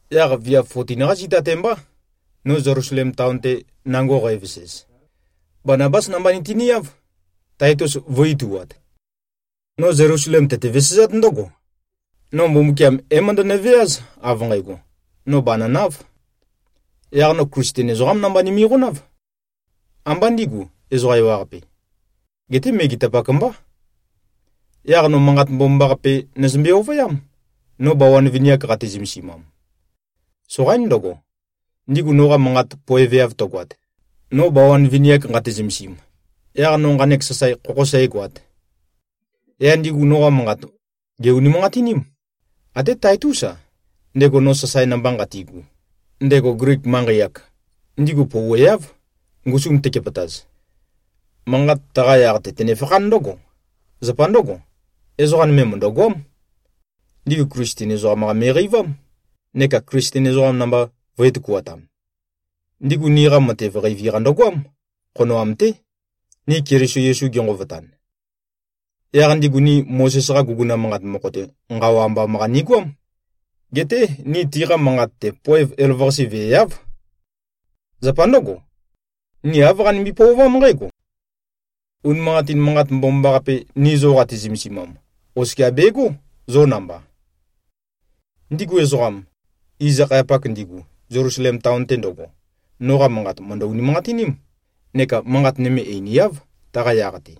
Yaq viav 14-qá zita-te mbá, no Zelusalem taon-te nango qævesez. Banabás namba nitiniáv, Taitus vø̄i-ituat. No Zelusalem tøte-vesezát ndǿgo: No Mbumbukiam é-møndønø-veáz, av nqægo, no bànønāv. Yaq no Klisten ezoqám namba nimiqonáv. Ambá ndigu, ezoqa ewaqape. Geté megetapak mbá. Yaq no Manqat Mbomambaqape nøzømbe-ovøyám, no bawan vini-ak qate-zømesimam. Soqaín ndøgo, ndigu noqa manqat poeveav tøgoat, no bawan vini-ak nqate-zømesim, yaq no nqanek sasae khokhō sægoāt. Yaq ndigu noqa manqat, gè-unimanqatiním. Até Taitús-a, ndego no sasae namba nqatigu, ndego Glik manqei-ak, ndigu pouweáv, ngusum tekepøtaz. Manqat taqa yaq-te tønefakhán ndǿgo: Zapa ndǿgo, ezoqa nøme mø̀ndøgoám. Ndigu Klisten ezoqam-qa me꞉qeivám, neka Klisten ezoqam namba vø̄e-tøkuatam. Ndigu niqa matev qeivi-qa ndøgoám, khonoam-té, ni Keliso Yesu genqovotan. Yaq ndigu ni Mozes-qa guguna manqat mokho-te nqawa ambam-qa nigoám. Geté ni tiqa manqat-te, poev elavøqase veeáv. Zapa ndǿgo, ni āv qanimbi-pøovám nqǽgo: Unimanqatin Manqat Mbomambaqape, ni zo qati-zømesimam, oskia begó zo namba. Ndigu ezoqam, iz-akhayapak ndigu, Zelusalem taon-te ndøgo, noqa manqat mø̀ndø-unimanqatiním, neka manqat nøme einiáv, taqa yaq-te.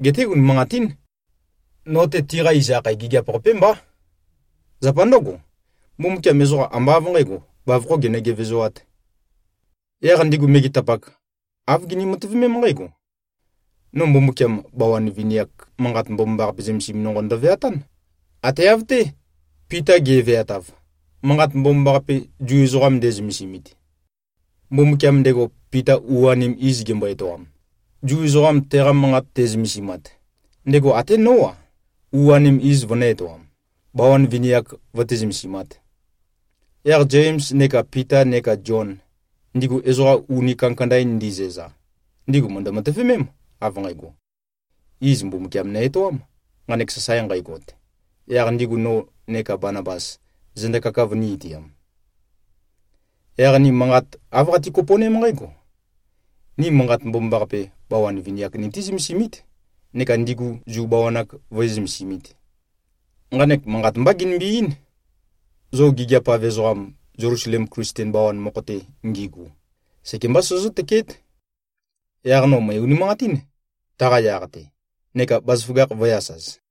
Geté, unimanqatín. No-te, tiqa iz akhae gigiap-qapé mbá. Zapa ndǿgo, Mbumbukiam ezoqa ambá av nqǣgo, bavokhō genø-gevezoāt. Yaq ndigu megetapak, āv gini-matøvemém nqǽgo: No Mbumbukiam, bawan vini-ak Manqat Mbomambaqape zømesim nonqo ndøveatán, ate av-té, Pita ge꞉veatav, Manqat Mbomambaqape Zu ezoqa nde꞉zømesimit. Mbumbukiam, ndego Pita u-anim iz gembo-etoam, Zu ezoqam teqa Manqat te꞉zømesimat, ndego até nó-a, u-anem iz vønø̄-etoam, bawan vini-ak vøté-zømesimāt. Yaq Zems neka Pita neka Zion, ndigu ezoqa uni kandakanda-in ndizæza, ndigu mø̀ndø-matøvemém, av nqægo: Iz Mbumbukiam nø-etoám, nqanek sasae nqægot, yaq ndigu no neka Banabas zenda kaka vønī-itiam. Yaq ni manqat āv qati-kopo꞉ném nqǽgo: Ni Manqat Mbomambaqape, bawan vini-ak nití-zømesimít neka ndigu Zu bawan-ak vǿe-zømesimīt. Nqanek manqat mbá ginimbi-eín: Zo gigiap-av ezoqam, Zelusalem Klisten bawan mokho-te ngigu, sekembá sozozǿ-tøkeét. Yaq no mø̀e-unimanqatín taqa yaq-te, neka bazaføgakh vø̄e-asaz.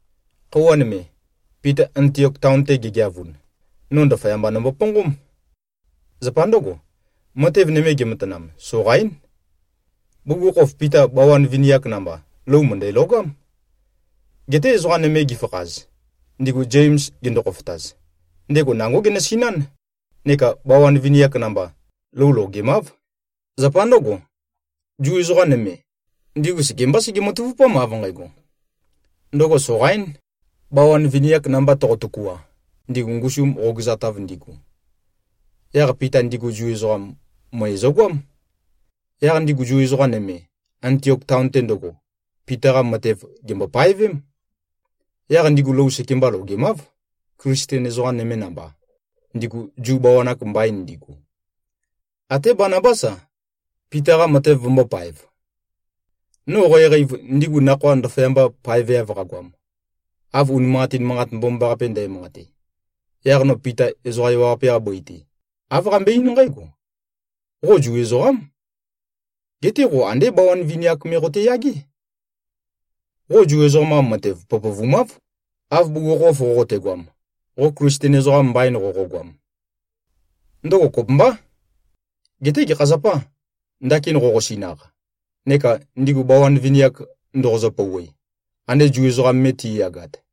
Khøuwa nøme, Pita Antiok taon-te gegeavun, no ndaføyamba nomboponqóm. Zapa ndǿgo, matev nøme gematanam, soqaín. Bugukhokhof, Pita bawan vini-ak namba, lou mø̀ndælogám. Geté ezoqa nøme gifakhaz, ndigu Zems gendo-khofotaz, ndego nangó genøsinán, neka bawan vini-ak namba, lou logemáv. Zapa ndǿgo, Zu ezoqa nøme, ndigu sekembá sege-matavupám, av nqægo: Ndøgo soqaín, bawan vini-ak namba toqo-tøkua, ndigu ngusum qogøzatav ndigu. Yaq Pita ndigu Zu ezoqam, møe zøgoám. Yaq ndigu Zu ezoqa nøme, Antiok taon-te ndøgo, Pita-qa matev, gèmbo-paevém. Yaq ndigu lou sekemba logemáv, Klisten ezoqa nøme namba, ndigu Zu bawan-ak mbain ndigu. Até Banabás-a, Pita-qa matev vømbōpaev. No qæqeiv, ndigu nakhoa ndaføyamba paeveav qagoam, av unimanqatin Manqat Mbomambaqape ndæmanqate, yaq no Pita ezoqa ewaqape-qa bøi-te, āv qambøe-eín nqǽgo, “Qo Zu ezoqám. Geté qo andé bawan vini-ak me qoteyagé. Qo Zu ezoqam-qa matev pøpøvumáv, av bugukhokhof qoqotegoam, qo Klisten ezoqam mbain qoqogoam. Ndøgo kopømbá. Geté gekha zapâ, ndakin qoqosinaq, neka ndigu bawan vini-ak ndoqozø-pouwe, ande Zu ezoqam me ti꞉yagat?”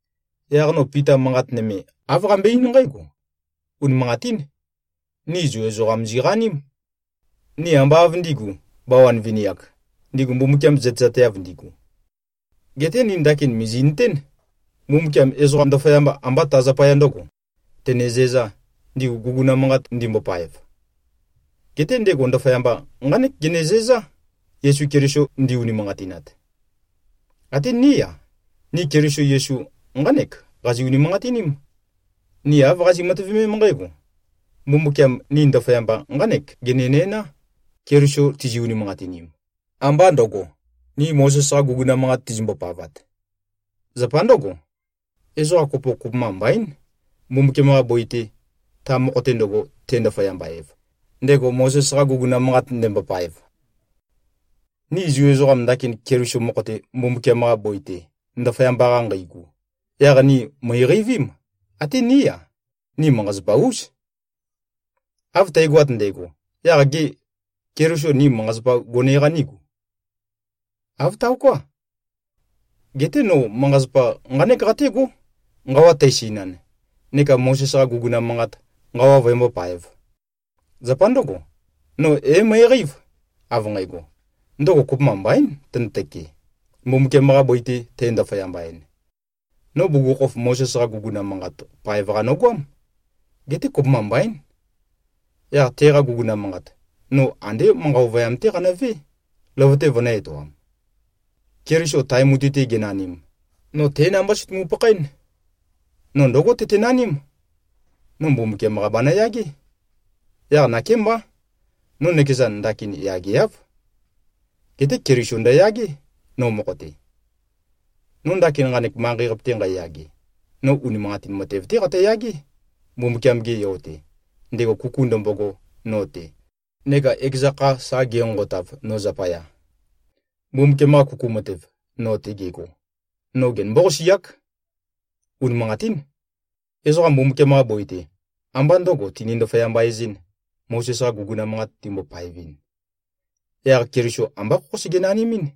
Yaq no Pita manqat nøme, āv qambøe-eín nqǽgo, “Unimanqatín. Ni Zu ezoqa ziqaním. Ni ambá av ndī꞉gu, bawan vini-ak, ndigu Mbumbukiam zøtezateav ndigu. Geté ni ndakin mìzi꞉nøtén, Mbumbukiam ezoqa, ndaføyamba ambá ta zapaya ndø̄go, tenezæzā, ndigu guguna manqat ndimbopaev. Geté ndego ndaføyamba, nqánek genezæzá, Yesu Keliso ndi-unimanqatinat. Até ní-a, ni Keliso Yesu nqánek qazi꞉-unimanqatiním. Ni āv qazi꞉-matøvemém nqǽgo: Mbumbukiam ni ndaføyamba nqánek genenæná, Keliso tizi-unimanqatinim, ambá ndø̄go, ni Mozes-qa guguna manqat tizimbo-pavat. Zapa ndǿgo, ezoqa kopo kopømba mbaín, Mbumbukiam-qa bøi-te, ta mokho-te ndøgo te꞉-ndaføyamba-ev, ndego Mozes-qa guguna manqat ndembopaev.” Ni Zu ezoqam ndakin Keliso mokho-te Mbumbukiam-qa bøi-te ndaføyamba-qa nqeigu, yaq ni mø̀iqeivím, ate ní-a, ni manqa-zapa-ús. Av tægoat ndægo, yaq gê, Keliso ni manqa-zapa gone-qa nígu? Āv taoká. Geté no manqa-zapa nqánek qatégó, nqawa tæsinan, neka Mozes-qa guguna manqat nqawa vøembópāev. Zapa ndǿgo, no é-møeqeív, av nqægo, ndøgo kopømba mbaín tønøtøke, Mbumbukiam-qa bøi-te tæ-ndaføyamba-en. No bugukhokhof Mozes-qa guguna manqat paev-qa nogoám. Geté kopømba mbaín. Yaq teqa guguna manqat, no andé manqa ovøyam-té qanøvé, løvøte vønø̄-etoam. Keliso tae mutui-te genanim, no té namba sø̀tumu-pakhaén. No ndǿgo tøtenaním: No Mbumbukiam-qa banøyagé. Yaq nakémbá. No nøkezan, ndakin yageáv. Geté Keliso ndøyagé, no mokho-te. No ndakin nqanek manqei-qape-te nqæyage, no unimanqatin matev-té qatøyagé, Mbumbukiam-ge Yo-te, ndego kuku ndømbogo no-te neka ekeza kha sa genqonqotav, no zapaya. Mbumbukiam-qa kuku matev, no-te gego, no genømbó-qasiák. Unimanqatín. Ezoqa Mbumbukiam-qa bøi-te amba ndø̄go tini-ndaføyamba-ezɨ̄n, Mozes-qa guguna manqat timbo-paevɨn, yaq Keliso ambá khokhó sege-nanimín.